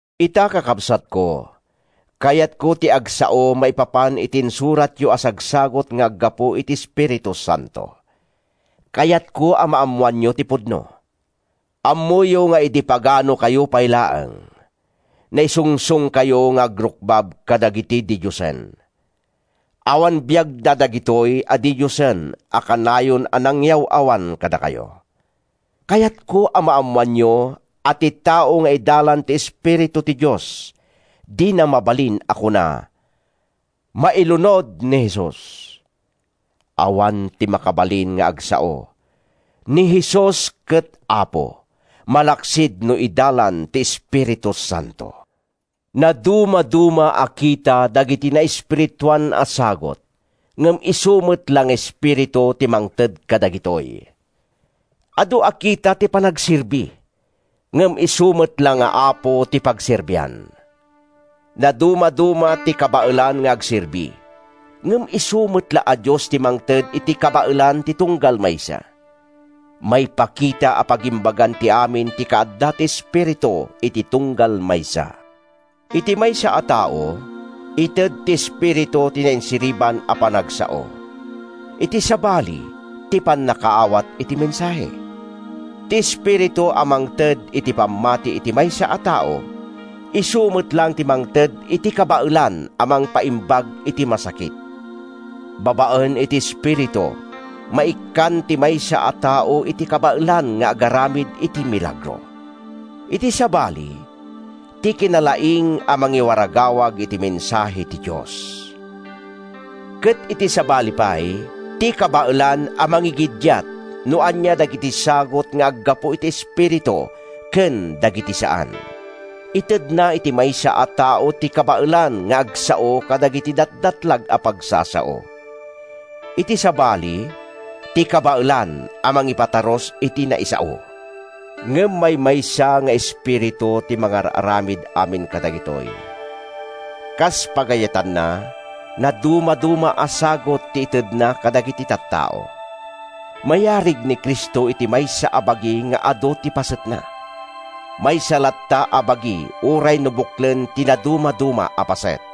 Ita, kakabsatko, kayatko ti agsao maipapan iti insuratyo a sagsagut nga aggapu iti Espiritu Santo. Kayatko a maammoanyo ti pudno. Ammoyo nga idi paganokayo pay laeng, naisungsongkayo nga agrukbab kadagiti didiosen. Awan biagda dagitoy a didiosen a kanayon a nangyaw-awan kadakayo. Kayatko a maammoanyo a ti tao nga idalan ti Espiritu ti Dios, dina mabalin a kuna, “Mailunod ni Jesus!” Awan ti makabalin nga agsao, “Ni Jesus ket Apo,” malaksid no idalan ti Espiritu Santo. Nadumaduma a kita dagiti naespirituan a sagut, ngem isu met la nga Espiritu ti mangted kadagitoy. Adu a kita ti panagserbi, ngem isu met la nga Apo ti pagserbian. Nadumaduma ti kabaelan nga agserbi, ngem isu met la a Dios ti mangted iti kabaelan ti tunggal maysa. Maipakita a pagimbagan ti amin ti kaadda ti Espiritu iti tunggal maysa. Iti maysa a tao, ited ti Espiritu ti nainsiriban a panagsao; iti sabali, ti pannakaawat iti mensahe. Ti Espiritu a mangted iti pammati iti maysa a tao, isu met laeng ti mangted iti kabaelan a mangpaimbag iti masakit. Babaen iti Espiritu, maikkan ti maysa a tao iti kabaelan nga agaramid iti milagro. Iti sabali, ti kinalaing a mangiwaragawag iti mensahe ti Dios. Ket iti sabali pay, ti kabaelan a mangigiddiat no ania dagiti sagut nga aggapu iti Espiritu ken dagiti saan. Itedna iti maysa a tao ti kabaelan nga agsao kadagiti datdatlag a pagsasao. Iti sabali, ti kabaelan a mangipatarus iti naisao. Ngem maymaysa nga Espiritu ti mangar-aramid amin kadagitoy; kas pagayatanna, nadumaduma a sagut ti itedna kadagiti tattao. Mayarig ni Cristo iti maysa a bagi nga adu ti pasetna. Maysa latta a bagi uray no buklen ti nadumaduma a paset.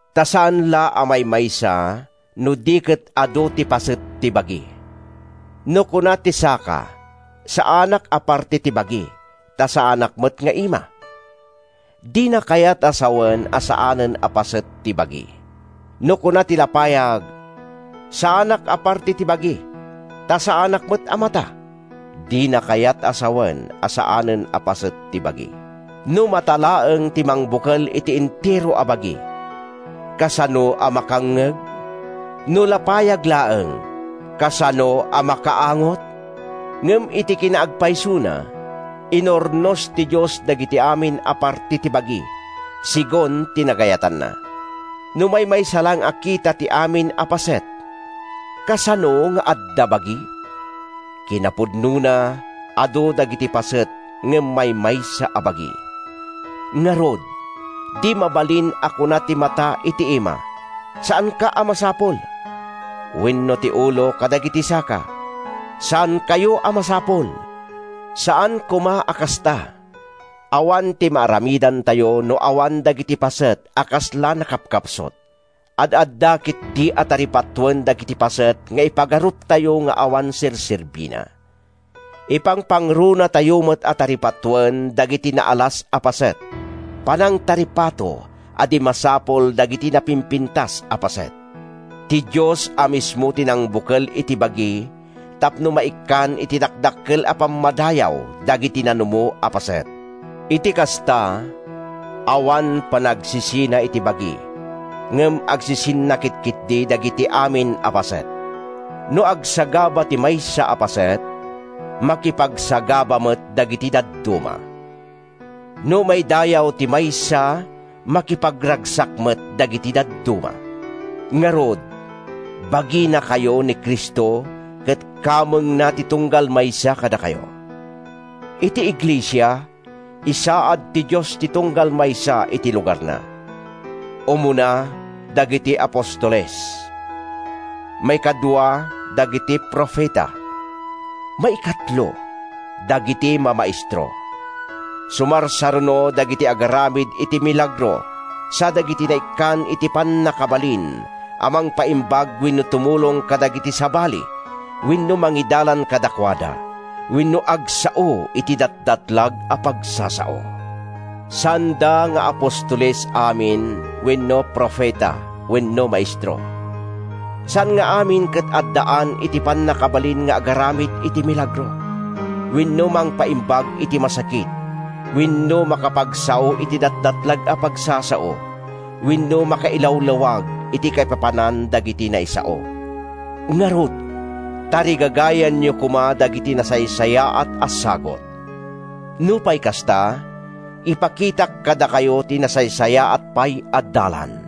Ta saan la a maymaysa no di ket adu ti paset ti bagi. No kuna ti saka, “Saanak a parte ti bagi, ta saanak met nga ima,” dina kayat a sawen a saanen a paset ti bagi. No kuna ti lapayag, “Saanak a parte ti bagi, ta saanak met a mata,” dina kayat a sawen a saanen a paset ti bagi. No mata laeng ti mangbukel iti entero a bagi, kasano a makangngeg? No lapayag laeng, kasano a makaangot? Ngem iti kinaagpaysona, inurnos ti Dios dagiti amin a parte ti bagi, segun ti nagayatanna. No maymaysa laeng a kita ti amin a paset, kasano nga adda bagi? Kinapudnona, adu dagiti paset ngem maymaysa a bagi. Ngarud, di mabalin a kuna ti mata iti ima, “Saanka a masapul!” Wenno ti ulo kadagiti saka, “Saankayo a masapul!” Saan koma a kasta! Awan ti maaramidtayo no awan dagiti paset a kasla nakapkapsut. Ad-adda ketdi a taripatoen dagiti paset nga ipagaruptayo nga awan serserbina. Ipangpangrunatayo met a taripatoen dagiti naalas a paset, panangtaripato a di masapul dagiti napimpintas a paset. Ti Dios a mismo ti nangbukel iti bagi tapno maikkan iti dakdakkel a pammadayaw dagiti nanumo a paset. Iti kasta, awan panagsisina iti bagi ngem agsisinnakit ketdi dagiti amin a paset. No agsagaba ti maysa a paset, makipagsagaba met dagiti dadduma. No maidayaw ti maysa, makipagragsak met dagiti dadduma. Ngarud, baginakayo ni Cristo ket kamengna ti tunggal maysa kadakayo. Iti iglesia, insaad ti Dios ti tunggal maysa iti lugarna: umuna, dagiti apostoles; maikadua, dagiti profeta; maikatlo, dagiti mamaestro; sumarsaruno, dagiti agaramid iti milagro sa dagiti naikkan iti pannakabalin a mangpaimbag wenno tumulong kadagiti sabali wenno mangidalan kadakuada wenno agsao iti datdatlag a pagsasao. Saanda nga apostoles amin wenno profeta wenno maestro. Saan nga amin ket addaan iti pannakabalin nga agaramid iti milagro wenno mangpaimbag iti masakit wenno makapagsao iti datdatlag a pagsasao wenno makailawlawag iti kaipapanan dagiti naisao. Ngarud, tarigagayanyo koma dagiti nasaysayaat a sagut. Nupay kasta, ipakitak kadakayo ti nasaysayaat pay a dalan.